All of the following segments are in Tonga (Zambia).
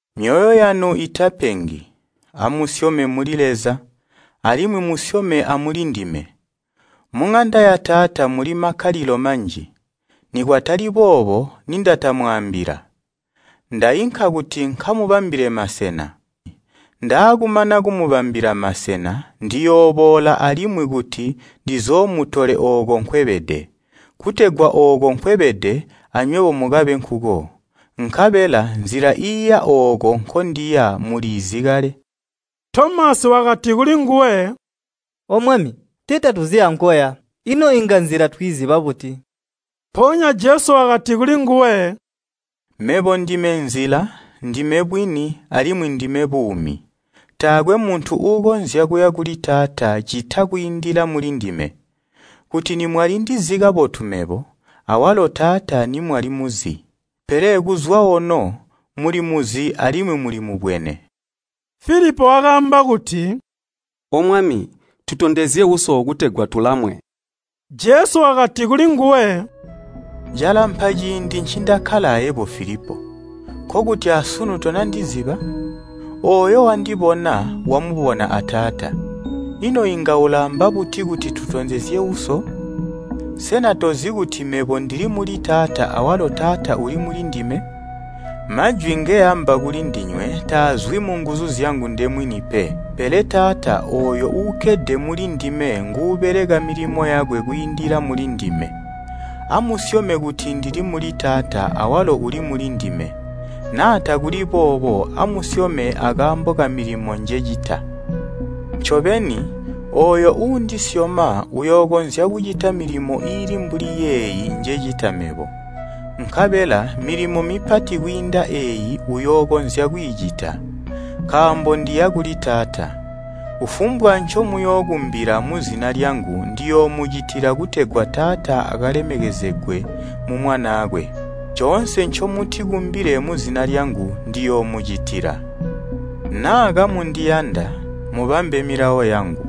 “Myoyo yanu itapengi. Amusyome muli Leza, alimwi musyome amulindime. Muŋanda ya Taata muli makkalilo manji, nikwatali boobo nindatamwaambila. Ndainka kuti nkamubambile masena. Ndaakumana kumubambila masena, ndiyooboola alimwi kuti ndizoomutole ooko nkwebede, kutegwa ooko nkwebede, anywebo mukabe nkuko. Nkabela nzila iiya ooko nkondiya muliizi kale.” Tomasi wakati kulinguwe, “O Mwami, tee tatuzi ankoya, ino inga nzila twiiziba buti?” Mpoonya Jesu wakati kulinguwe, “Mebo ndime nzila, ndime bwini, alimwi ndime buumi. Taakwe muntu uukonzya kuya kuli Taata ccita kwiindila mulindime. Kuti nimwali ndizi kabotu mebo, awalo Taata nimwalimuzi. Pele kuzwa ono mulimuzi alimwi mulimubwene.” Filipo wakaamba kuti, “O Mwami, tutondezye Uso kutegwa tulamwe.” Jesu wakati kulinguwe, “Calampa ciindi ncindakkala ayebo Filipo, nkokuti asunu tonandiziba? Ooyo wandibona, wamubona a Taata. Ino inga ulaamba buti kuti, ‘Tutondezye Uso?’ Sena tozi kuti mebo ndili muli Taata awalo Taata uli mulindime? Majwi ngeamba kulindinywe taazwi munguzu zyangu ndemwini pe, pele Taata ooyo uukkede mulindime nguubeleka milimo yakwe kwiindila mulindime. Amusyome kuti ndili muli Taata awalo uli mulindime. Naa takuli boobo, amusyome akaambo kamilimo njecita. “Ncobeni, ooyo uundisyoma uyookonzya kucita milimo iili mbuli yeeyi njecita mebo. Nkabela milimo mipati kwiinda eeyi uyookonzya kwiicita, nkaambo ndiya kuli Taata. Kufumbwa ncomuyookumbila muzina lyangu ndiyoomucitila kutegwa Taata akalemekezegwe mu Mwanaakwe. Coonse ncomutikumbile muzina lyangu, ndiyoomucitila. “Naa kamundiyanda, mubambe milawo yangu.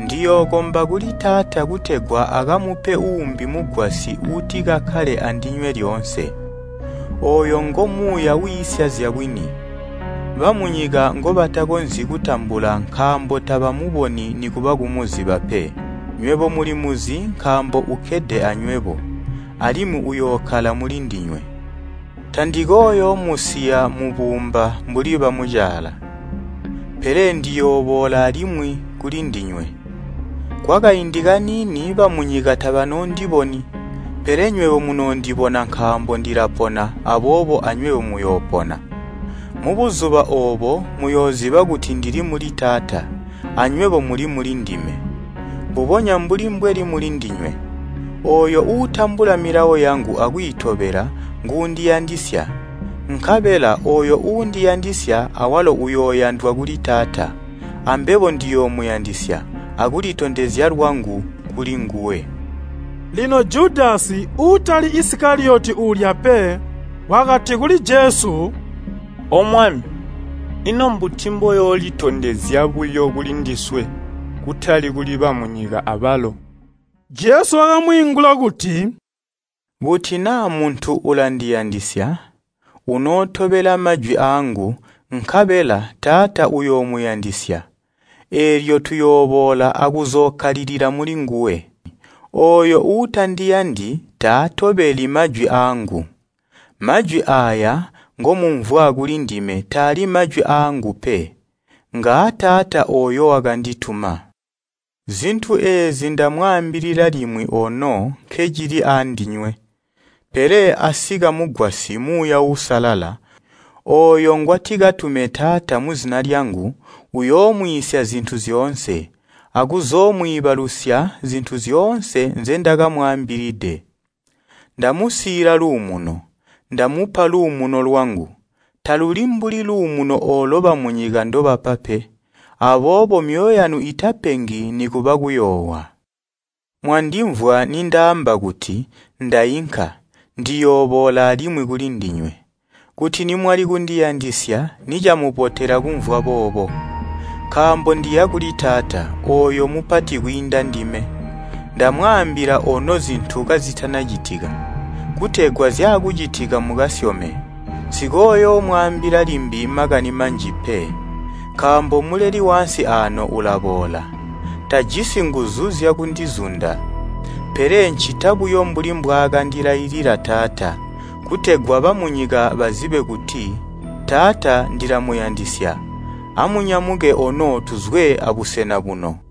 Ndiyookomba kuli Taata kutegwa akamupe uumbi Mugwasyi uutikakkale andinywe lyoonse. Ooyo ngo Muuya wiisya zyabwini. Bamunyika ngobatakonzyi kutambula nkaambo tabamuboni nikuba kumuziba pe. Nywebo mulimuzi nkaambo ukkede anywebo, alimwi uyookkala mulindinywe. “Tandikooyoomusiya mubuumba mbuli bamucaala, pele ndiyooboola alimwi kuli ndinywe. Kwakaindi kaniini bamunyika tabanoondiboni, pele nywebo munoondibona nkaambo ndilapona aboobo anywebo muyoopona. Mubuzuba oobo muyooziba kuti ndili muli Taata, anywebo muli mulindime, mbubonya mbuli mbweli mulindinywe. Ooyo uutambula milawo yangu akwiitobela nguundiyandisya. Nkabela ooyo uundiyandisya awalo uyooyandwa kuli Taata, ambebo ndiyoomuyandisya akulitondezya lwangu kulinguwe.” Lino Judasi (uutali Isikaliyoti uulya pe) wakati kuli Jesu, “O Mwami, ino mbuti mboyoolitondezya buyo kulindiswe, kutali kuli bamunyika abalo?” Jesu wakamwiingula kuti, “Kuti naa muntu ulandiyandisya, unootobela majwi aangu, nkabela Taata uyoomuyandisya, eelyo tuyooboola akuzookkalilila mulinguwe. Ooyo uutandiyandi taatobeli majwi aangu. Majwi aaya ngomumvwa kulindime taali majwi aangu pe, ngaa Taata ooyo wakandituma. “Zintu eezi ndamwaambilila limwi ono nkencili aandinywe. Pele asika Mugwasyi, Muuya Uusalala, ooyo ngwatikatume Taata muzina lyangu, uyoomwiisya zintu zyoonse, akuzoomwiibalusya zintu zyoonse nzendakamwaambilide. “Ndamusiila luumuno. Ndamupa luumuno lwangu. Taluli mbuli luumuno oolo bamunyika ndobapa pe. Aboobo myoyo yanu itapengi nikuba kuyoowa. Mwandimvwa nindaamba kuti, ‘Ndainka, ndiyooboola alimwi kulindinywe.’ Kuti nimwali kundiyandisya nicamubotela kumvwa boobo, nkaambo ndiya kuli Taata, ooyo mupati kwiinda ndime. Ndamwaambila ono zintu kazitanacitika, kutegwa zyaakucitika mukasyome. Nsikooyoomwaambila limbi makani manji pe, nkaambo muleli waansi aano ulaboola. Tajisi nguzu zyakundizunda. Pele ncita buyo mbuli mbwaakandilailila Taata, kutegwa bamunyika bazibe kuti Taata ndilamuyandisya. “Amunyamuke ono tuzwe abusena buno.